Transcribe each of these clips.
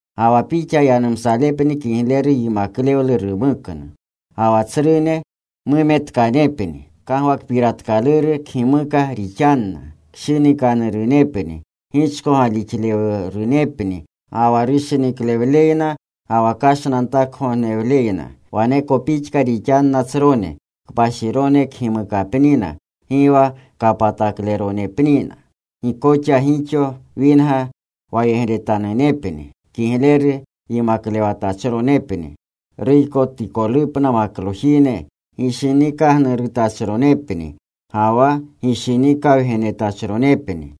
Ga wa pixa yanumsalepni kigleru yimaklewlu rumuknu. Ga wa tsrune mumetkanepni, kagwakpiratkaluru kgimuka rixanna. Kshinikanurunepni. Gichko galixlewlerunepni ga wa rushiniklewleyna ga wa kashnantakgognewleyna. Waneko pixka rixanna tsrone. Kpashirone kgimukapnina. Gi wa kapatakleronepnina. Gi koxa gixo winga wayegretanunepni. Kigleru yimaklewatachronepni, ruykotikolupna maklojine gishinikagnurutachronepni ga wa gishinikawgenetachronepni.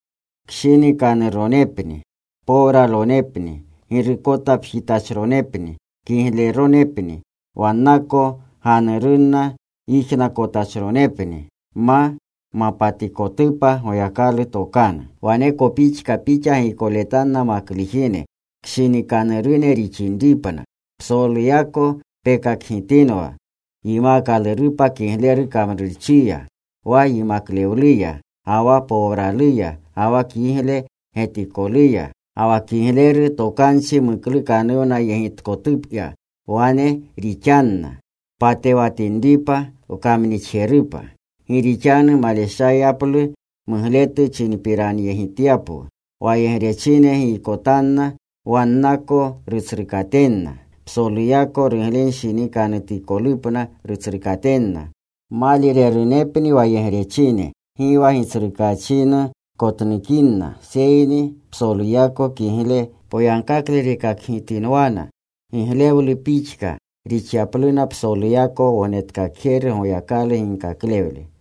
Kshinikanuronepni. Powralonepni. Girukotapjitachronepni. Kigleronepni. Wannako ganurunna yijnakotachronepni ma mapatikotupa Goyakalu tokanu. Waneko pixka pixa giykoletanna maklujine kshinikanurunepni rixinripna. Psoluyako pekakgitinwa yimkalurupa kigleru kamrurchiya, wa yimaklewluya ga wa powraluya ga wa kigle getikoluya, ga wa kigleru tokanchi muklukpiranyegitkotuya. Wane rixanna patewatinripa wkamnixjerupa, gi rixanu maleshayaplu mugletu chinpiranyegityapwu. Wayegrechine yijnakotanna wannako rutsrukatenna. Psoluyako ruglenshinikanutikolupna rutsrukatenna. Maalirerunepni wayegrechine. Gi wa gitsrukaachinu kotnukinna, seyni psoluyako kigle poyagkakle rekakgitinwana, giglewlu pixka rixyapluna psoluyako Wognetkakjeru Goyakalu ginkaklewle.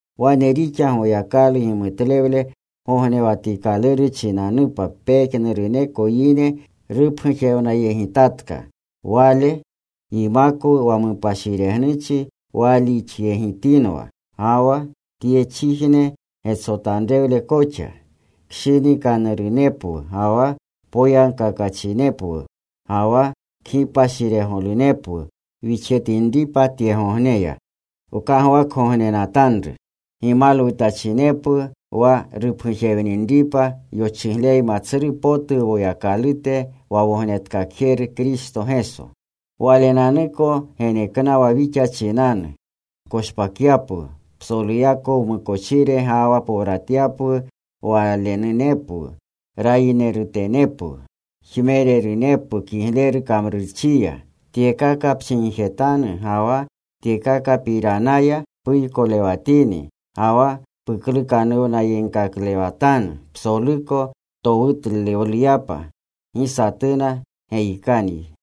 Wane rixa Goyakalu gimutlewle gognewatikaluru chinanupa pejnuruneko yine rupgujewnayegitatka. Wale yimakwu wa mupashiregnuchi waalixyegitinwa, ga wa tyechijne getsotanrewle koxa. Kshinikanurunepwu ga wa poyagkakachinepwu ga wa kgipashiregolunepwu wixjetinripa tyegogneya. Wkagwakgognenatanru gimalwutachinepwu wa rupgujewninripa yochigleyma tsru potu Woyakalute wa Wognetkakjeru Kristo Geso. Walenanuko geneknawa wixa chinanu koshpakyapwu psoluyako wmukochire, ga wa powratyapwu Walenunepwu, rayinerutenepwu. Jmererunepwu kigleru kamrurchiya. Tyekaka pchinjetanu, ga wa tyekakapiranaya puykolewatini ga wa puklukanuwnakaklewatanu psoluko towutlewluyapa. Gi satuna geyikanyi.